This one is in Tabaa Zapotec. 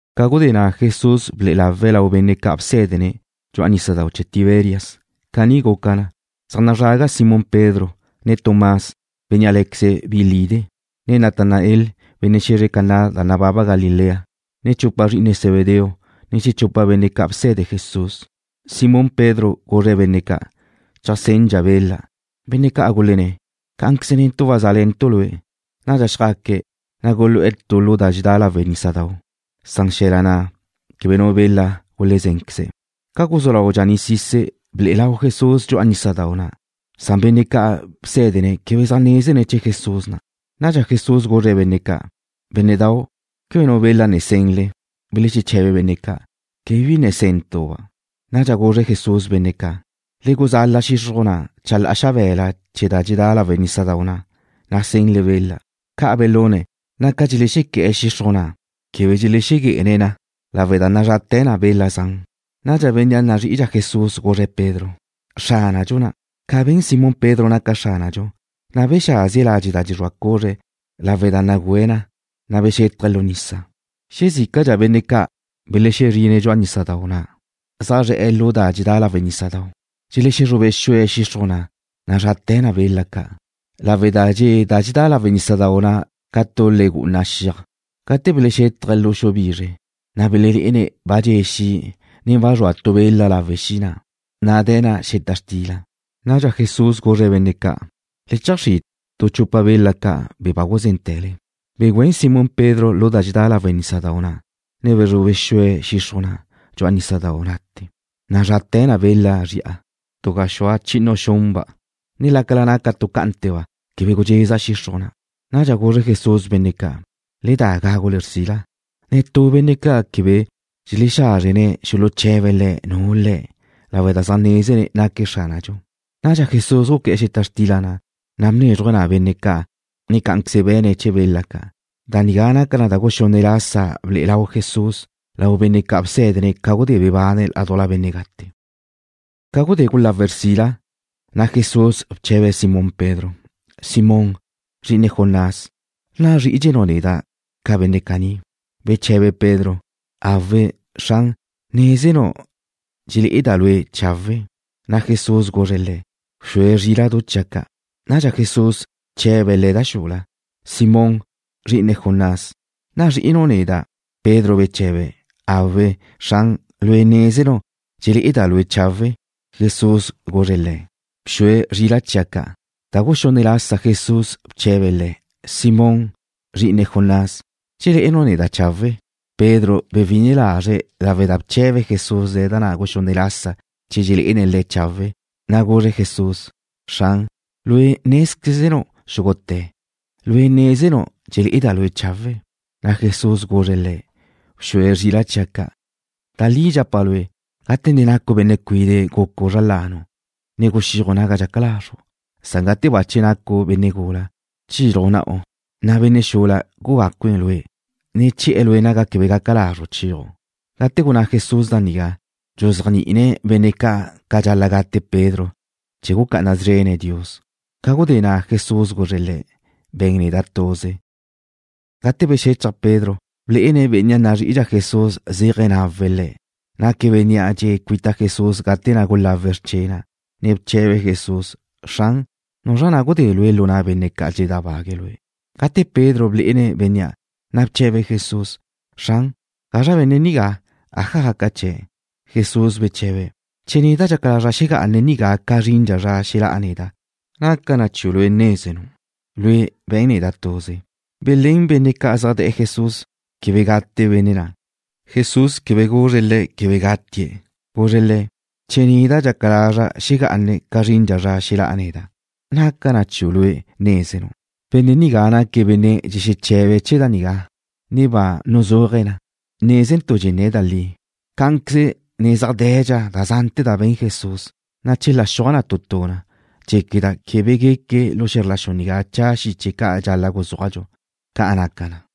Ca gudé na' Jesús ble'e lawe̱' lau benne' ca' bsé̱dene̱' dxu'a nísadau' chee̱ Tiberias. Caní guca na. Zaj nazraga Simón Pedro, ne Tomás, bénnea' lé̱queze̱' Bi Lide', ne Natanael, benne' xe̱zre Caná da nababa Galilea, ne chupa zri'ine Zebedeo, ne xechupa benne' ca' bse̱de Jesús. Simón Pedro guzre̱' benne' ca': ―Cheajsendxa' bela. Benne' ca' gulenné̱': ―Cá'anqueze netu' wazá'le̱ntu' lue'. Nadxa xjaque̱', na' gulu'e̱ tu lu da dxedá lawe' nísadau'. Xe̱la na' quebe nu bela gulezénqueze̱'. Ca guzú lau dxaní'sise̱', ble'e lau Jesús dxu'a nísadau' na'. Benne' ca' bsé̱dene̱' quebe zaj nézene̱' che Jesús na'. Nadxa Jesús guzre̱' benne' ca': ―Bénne'dau', ¿quebe nu bela ne senle? Belexeche̱be benne' ca': ―Quebe bi ne sentu'-ba'. Nadxa guzre Jesús benne' ca': ―Le guzala xixruj na' chalá'a xabe̱la chee̱ da dxedá lawe' nísadau' na', na' senle bela. Ca' belune̱', na' ca dxelexequé̱'e̱ xixruj na' quebe dxelexegué'ene̱' na lawe' da nazrate̱ na bela zan. Nadxa bénnea' nazrí'idxa Jesús guzre̱' Pedro: ―Xránadxu na'. Ca ben Simón Pedro naca Xránadxu, na' bexázie̱' ladxe' dxexrúa cuzre̱' lawe' da nagüe̱' na, na' bexétaje̱' lu nisa. Xezícadxa benne' ca' belexezrine̱' dxu'a nísadau' na', zaj zre̱'e̱ lu da dxedá lawe' nísadau', dxelexezrube xue̱' xixruj na' nazrate̱ na bela ca' lawe' da dxe' da dxedá lawe' nísadau' na' lu nísadau' ca tu le gu'una xiaj. Gate belexétaje̱' lu xu bizre, na' belelé'ene̱' ba dxe' xi', ne ba zrua tu bela lawe' xi' na', na' de̱ na' xeta xtila. Nadxa Jesús guzre̱' benne' ca': ―Le cheajxrí' tu chupa bela ca', be̱ za guzénte̱le. Begüén Simón Pedro lu da dxedá lawe' nísadau' na', ne bezrube xue̱' xixruj na' dxu'a nísadau' na'te̱, nazrate̱ na bela zri'a, tu gaxúa chi'inu xunba', na' lácala naca tu cá'ante̱ba' quebe gudxeza xixruj na'. Nadxa guzre Jesús benne' ca': ―Le da gágule xrsila. Netú benne' ca' quebe dxelexázrene̱' xuluche̱be̱' Le̱' nu Le̱', lawe' da zaj nézene̱' naque̱' Xránadxu. Nadxa Jesús guqué̱'e̱ xeta xtila na', na' bnézruje̱' na benne' ca', ne cá'anqueze be̱ne̱' chee̱ bela ca'. Da nigá naca na da guxunne' lasa ble'e lau Jesús lau benne' ca' bsé̱dene̱' ca gudé bebane̱' ládujla benne' gate. Ca gudé gulawe̱' xrsila, na' Jesús bche̱be̱' Simón Pedro: ―Simón, zri'ine Jonás, ¿nazrí'idxenu' neda' ca benne' caní? Beche̱be Pedro: ―Awe', Xran, nézenu' dxelé'eda' Lue' chawe'. Na' Jesús guzre̱' le̱': ―Bxue zríla'du chia' ca'. Nadxa Jesús bche̱be̱' le̱' da xula: ―Simón, zri'ine Jonás, ¿nazrí'inu' neda'? Pedro beche̱be̱': ―Awe', Xran, Lue' nézenu' dxelé'eda' Lue' chawe'. Jesús guzre̱' le̱': ―Bxue zrila' chia' ca'. Da guxunne' lasa Jesús bche̱be̱' le̱': ―Simón, zri'ine Jonás, ¿dxelé'enu' neda' chawe'? Pedro bewi'ine lazre̱' lawe' da bche̱be Jesús le̱' da guxunne' lasa che dxelé'ene̱' Le̱' chawe', na' guzre̱' Jesús: ―Xran, Lue' nézquezenu' xúgute̱. Lue' nézenu' dxelé'eda' Lue' chawe'. Na' Jesús guzre̱' le̱': ―Bxue zrila' chia' ca'. Da li dxapa' lue', gate ne nacu' benne' cuide' gucu' zra lanu', ne guxíaju' naga dxaca lazru'. Gate bache nacu' benne' gula, chilju' na'u, na' benne' xula gugácue̱' lue', ne che̱'e̱ lue' naga quebe gaca lazru' chéaju'. Gate gunná Jesús da nigá, dxuzéajni'ine̱' benne' ca' ca dxal-la' gate' Pedro chee̱ gucá'ana szrene̱' Dios. Ca gudé na' Jesús guzre̱' le̱': ―Be̱n neda' tuze. Gate bexechaj Pedro, blé'ene̱' bénnea' nazrí'idxa Jesús zéaje̱ nawe̱' le̱', naque̱' bénnea' dxe'e̱ cuita Jesús gate na' gulawe̱' xrche' na', ne bche̱be̱' Jesús: “Xran, ¿nuzra na' gudé Lue' lu na' benne' ca' dxeledábague̱' lue'?” Gate Pedro blé'ene̱' bénnea', na' bche̱be̱' Jesús: ―Xran, ¿gazra benne' nigá? ¿Aja gaca chee̱'? Jesús beche̱be̱': ―Che neda' dxaca lazra' xegá'ane̱' nigá ca zrindxa zra xelá'a neda', ¿naca na chiu' lue' nézenu'? Lue', be̱n neda' tuze. Belén benne' ca' zaj de̱'e̱ Jesús quebe gate benne' na'. Jesús quebe guzre̱' le̱' quebe gatie̱'. Guzre̱' le̱': “Che neda' dxaca lazra' xegá'ane̱' ca zrindxa zra xelá'a neda', ¿naca na chiu' lue' nézenu'?” Benne' nigá naque̱' benne' dxexeche̱be̱' chee̱ da nigá, ne ba nuzúaje̱' na. Nézentu' dxenné̱' da li. Cá'anqueze ne zaj de̱dxa da zante̱ da be̱n Jesús, na' chela xuaj tu tu na, dxéqueda' quebe gueque lu xe̱zr la xu nigá cha' xiche ca' dxal-la' guzúajdxu. Ca' naca na.